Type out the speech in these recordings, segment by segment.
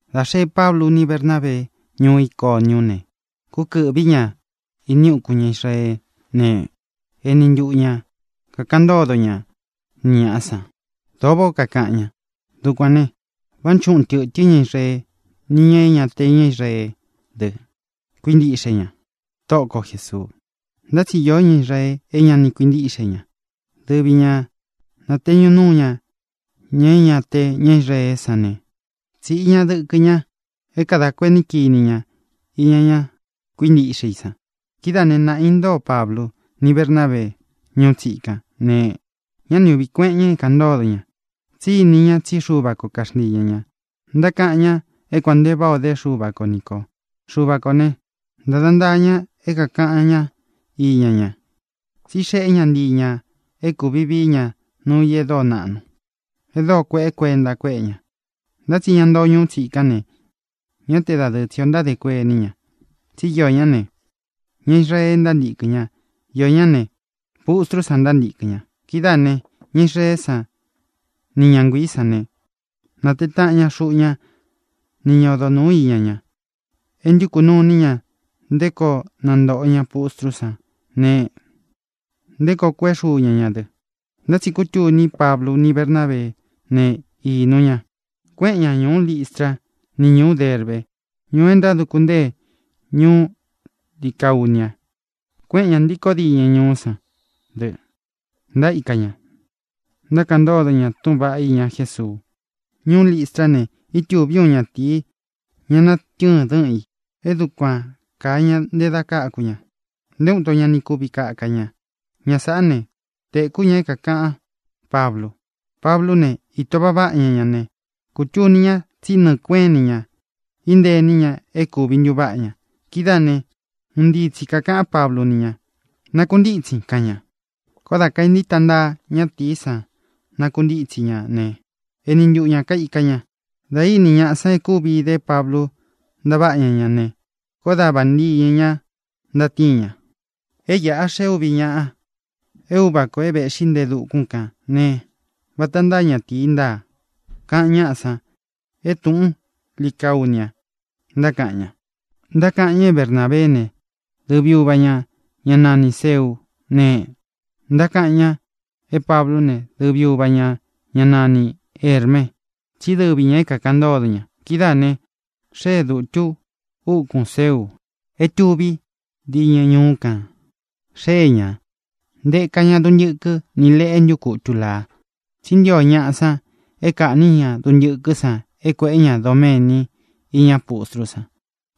Dā xeé Pablu ni Bernábee ñuú Iconiú ne, kúkɨ̄ꞌví ña ini ukún ña Israeé ne, eni ntuꞌu ña kākaꞌan ntódo ña ni ñāꞌa san. Dōo váꞌā ó kakaꞌan ña. Dukuān ne, vánchuꞌun tɨ̄tɨ́n ña Israee ni ñáꞌa é ña te ña Israeé dɨ, kuíntiꞌxe ña Tóꞌo ko Jēsuu. Ntá tsi iō ñá Israee é ña ni kuintíꞌxe ña. Dɨvi ñā nateñu núu ña ña é ña te ña Israeé san ne, tsīꞌi ña dɨkɨ ña é kadā kuení kini ña iña ña kuíntiꞌxe i san. Kidáā né, naꞌā intóo Pablu ni Bernábee ñuú tsikan ne, ñá ni ūꞌví kueꞌen ña é kāꞌan ntódo ña, tsí ini ña tsí Xuva ko kaxntii ña ñā. Ntákaꞌan ña é kuān nte váꞌā o dé Xuva ko ni kō. Xuva kō né, ntāda ntaa ña é kākaꞌan ñá iña ña, tsí xeꞌé ña ntii ñā é kūvi vií ña nuu i e dóo naꞌnu, e dóo kueꞌe kuenta kuéꞌe ña. Ntá tsi ña ntoo ñuu tsikán ne, ñá te dadɨɨ tsī ó ntádē kuení ña; tsi íō ñá ne, ña Israee ntántīkɨn ñá ne, iō ñá ne, pustrú san ntántikɨ̄n ña. Kidáā ne, ña Israeé san ni ña nguiī sán ne, nātee táꞌan ña xuꞌu ña ni ña odo nūu iña ña, é ntukū nuu iní ña nté koo nantōꞌo ña pustrú san ne, nté koo kueꞌé xuu ña ña dɨ. Ntá tsi kútuni Pablu ni Bernábeé ne, īnu ña, kueꞌen ña ñuú Listra ni ñuú Derbe, ñuu é ntáduku ntée ñuú Licaunia. Kuéꞌen ñā ntíkō diñɨ ñuú san dɨ, ntaíka ña, ntákaꞌan ntódo ña túꞌūn vaꞌá iña Jésuu. Ñuú Listrá ne, ítūví uun ñatīi, ña natɨ́ɨn dɨ́ꞌɨn ī. E dúkuan kāa ña nte da káku ña. Nté uun ito ña ni kuvi kaka ña. Ña sāꞌá ne, tekú ña é kākaꞌan Páblu. Pablú ne, īto váꞌa váꞌa ña ña ne, kūtuni ña tsí nɨɨ̄ kueꞌén ini ña intée ini ña é kūvi ntuváꞌa ña. Kidáā ne, un ntíi tsi kākaꞌán Pablu ni ña: —¡Nakuntítsin! —kaꞌan ña. Koó dā kaentíta ntaa ñatīí san nakuntítsi ña ne, eni ntuꞌu ña kaīka ña. Dā íni ñaꞌa san é kúvi idé Pablu ntaváꞌa ña ña ne, koó da vañɨ ñā ntatíin ña: —¡É iꞌa xée úvi ñāꞌa é uva kō é vēꞌxí nte e dukún kān ne, vata ntáa ñatīi ntáa! —kaꞌan ñáꞌa san é tūꞌún Licaunia ntákaꞌan ña. Ntákaꞌan ña é Bernābeé ne, dɨvi uva ñā, ñá nanī Zeú ne, ntákaꞌan ña é Pablú ne, dɨvi uva ñā, ñá nanī Herme, tsí dɨvi ñā é kākaꞌan ntódo ña. Kidáā ne, xée dutu úkun Zeu é tuví diñɨ ñuú kān. Xée ña, ntēka ña duntɨkɨ ni leꞌe é ntukutu lāa. Tsí ntio ñaꞌa san é kaꞌnī ñá duntɨkɨ́ san é kuēꞌé ña doméni iña pústrú san,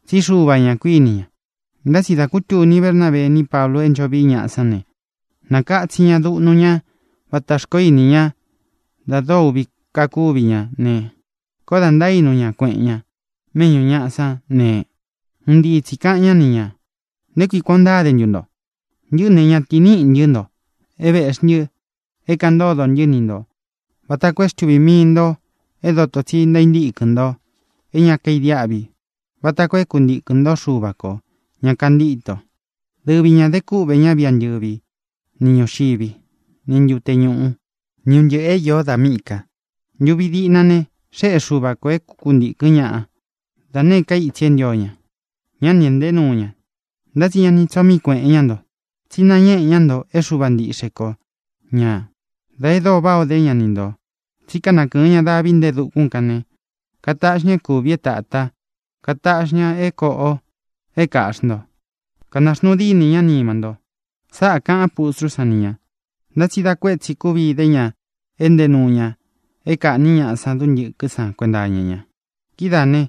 tsí xuva ñā, kuíni ña. Ntá tsi dā kútuni Bernábee ni Páblu é ncho vií ñaꞌa sán ne, nākatsin ña duꞌnu ñá vata xkoó ini ña da dóo uꞌvi kakúvi ña ne, koó dā ntaínu ña kueꞌen ña méꞌñū ñaꞌa san ne, un ntii tsī kaꞌan ñá ni ñā: —¿Nté kui kuān ó ntáde ntu nto? Ntɨꞌɨ́ ne, ñatīí niꞌī ntɨ́ nto. É veꞌxi ntɨ é kāꞌan ntódo ntɨ́ ni ntō vata koo é xtuvī mii nto é dótō tsi ntaíntíkɨn nto é ña kaidiáꞌvi vata koo é kuntīkɨn ntó Xuva kō, ña kantíto. Dɨvi ñā de kúꞌvē ñá viꞌi antɨ̄ví ni ñūxiví, ni ntute ñuꞌu, ni un ntɨꞌɨ̄ é īó da míꞌī ka. Ntuvi diꞌna ne, xéꞌe Xuva kō é kuntīkɨn ñáꞌa da nēé ka itsi e ntío ña; ñá ni ēꞌnté nuu ña. Ntá tsi ña ni tsoo mií kueꞌen ñá nto, tsi náñeꞌe ñá nto é Xuva ntiꞌxe ko ñā da é dóo váꞌā o dé ña ni ntō. Tsí kanakɨɨn ña davi nte e dukún kān ne, kataꞌxi ña é kūvi é tata, kataꞌxi ña é kōꞌo é kāꞌxi ntó, kanaxnuu dínī ñá nima nto. Sáꞌā kaꞌán pustrú san ni ñā. Ntá tsi dá kuētsi kúvi idé ña éꞌnte nuu ña é kāꞌní ñaꞌa san duntɨkɨ́ san kuenta iña ña. Kidáā ne,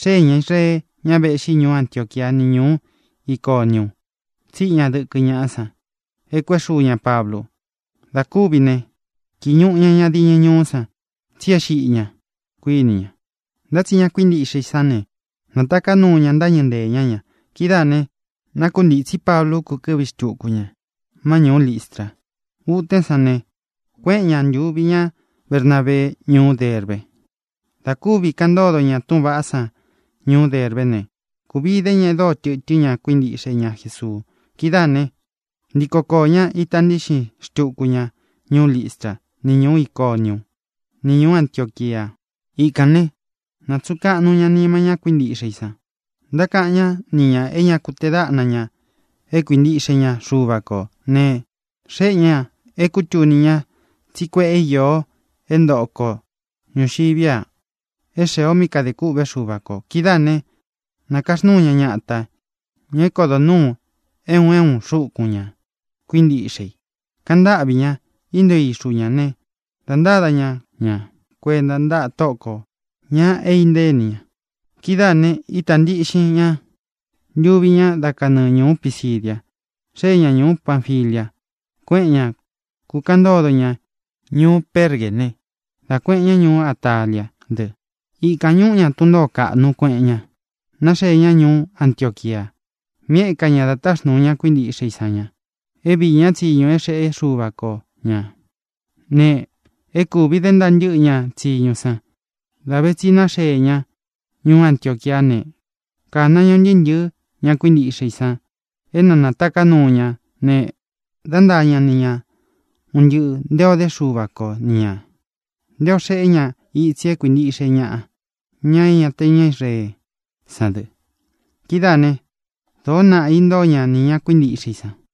xéē ña Israee, ña véꞌxi ñuú Antioquia ni ñuú Iconiu, tsíꞌi ña dɨkɨ ñaꞌá san é kuēꞌé xuu ña Pablu. Dā kúvi ne, kīi ñuꞌu ña ña diñɨ ñuú san, tsí e xíꞌi ña, kuīní ña. Ntá tsi ña kuíntiꞌxe i sán ne, nātaká nuu ña, ntáñɨ̄ ntée ña ña. Kidáā ne, nákuntītsí Pablu, kúkɨ̄ꞌví xtuku ña má ñūú Listra. Utén san ne, kuéꞌen ñā, ntuvi ñá Bernabee, ñuú Derbe. Dā kúvi kaꞌan ntódo ña túꞌūn vaꞌá san ñuú Derbé ne, kūvi idé ña e dóo tɨtɨ́n ñaꞌa kuíntiꞌxe ña Jesuu. Kidáā ne, ntíko koō ñá, ita ntíꞌxin xtuku ña ñuú Listra, ni ñuú Iconiu, ni ñuú Antioquia. Ikān ne, nátsuꞌun kaꞌnu ña nima ñá kuíntiꞌxe i san, ntákaꞌan ñá ni ñā é ña ku tee dáꞌna ñā é kuintiꞌxe ña Xuva kō ne, xéꞌe ñā é kūtuni ña tsí kueꞌe īo é ntoꞌo ko ñūxiví a é xēe o mí kadē kûꞌvé Xuva kō. Kidáā ne, nakaxnúu ña ñatā, ña é kodo nūu é un é un xúkun ña kuíntiꞌxe i. Kaꞌan ntáꞌvī ñá, intóo ixu ña ne, dā ntáda ña ña kuenta ntáꞌa Tóꞌo kō, ña é intée ini ña. Kidáā ne, ítā ntiꞌxin ña, ntuvi ña, dá kanɨɨ ñūú Pisidia, xee ña ñuú Panfilia. Kuéꞌen ña, kūkaꞌan ntódo ña ñuú Pergé ne, dá kuēꞌen ña ñuú Ataliá dɨ. Ikān ñuꞌú ña tun ntōó kaꞌnu, kuéꞌen ña, náxee ña ñuú Antioquia, mí eka ña da táxnūu ña kuíntiꞌxe i san ña é viī ñá tsiñu é xeꞌe Xúva ko ñā. Ne, é kūvi dé ntaa ntɨ́ꞌɨ ña tsiñu san. Dā ve tsi náxee ña ñuú Antioquiá ne, kāna ña un ntɨɨ́ ntɨ̄ɨ́ ña kuíntiꞌxe i san é na nātaká nuu ña ne, dá ntaa ña ni ña un ntɨꞌɨ̄ nté ō dé Xuva ko ni ñā, nté ō xeꞌé ña itsi é kuīntiꞌxe ñaꞌa, ña é ña te ña Israeé san dɨ. Kidáā né, dōó naꞌa īntóo ña nī ña kuíntiꞌxe i san.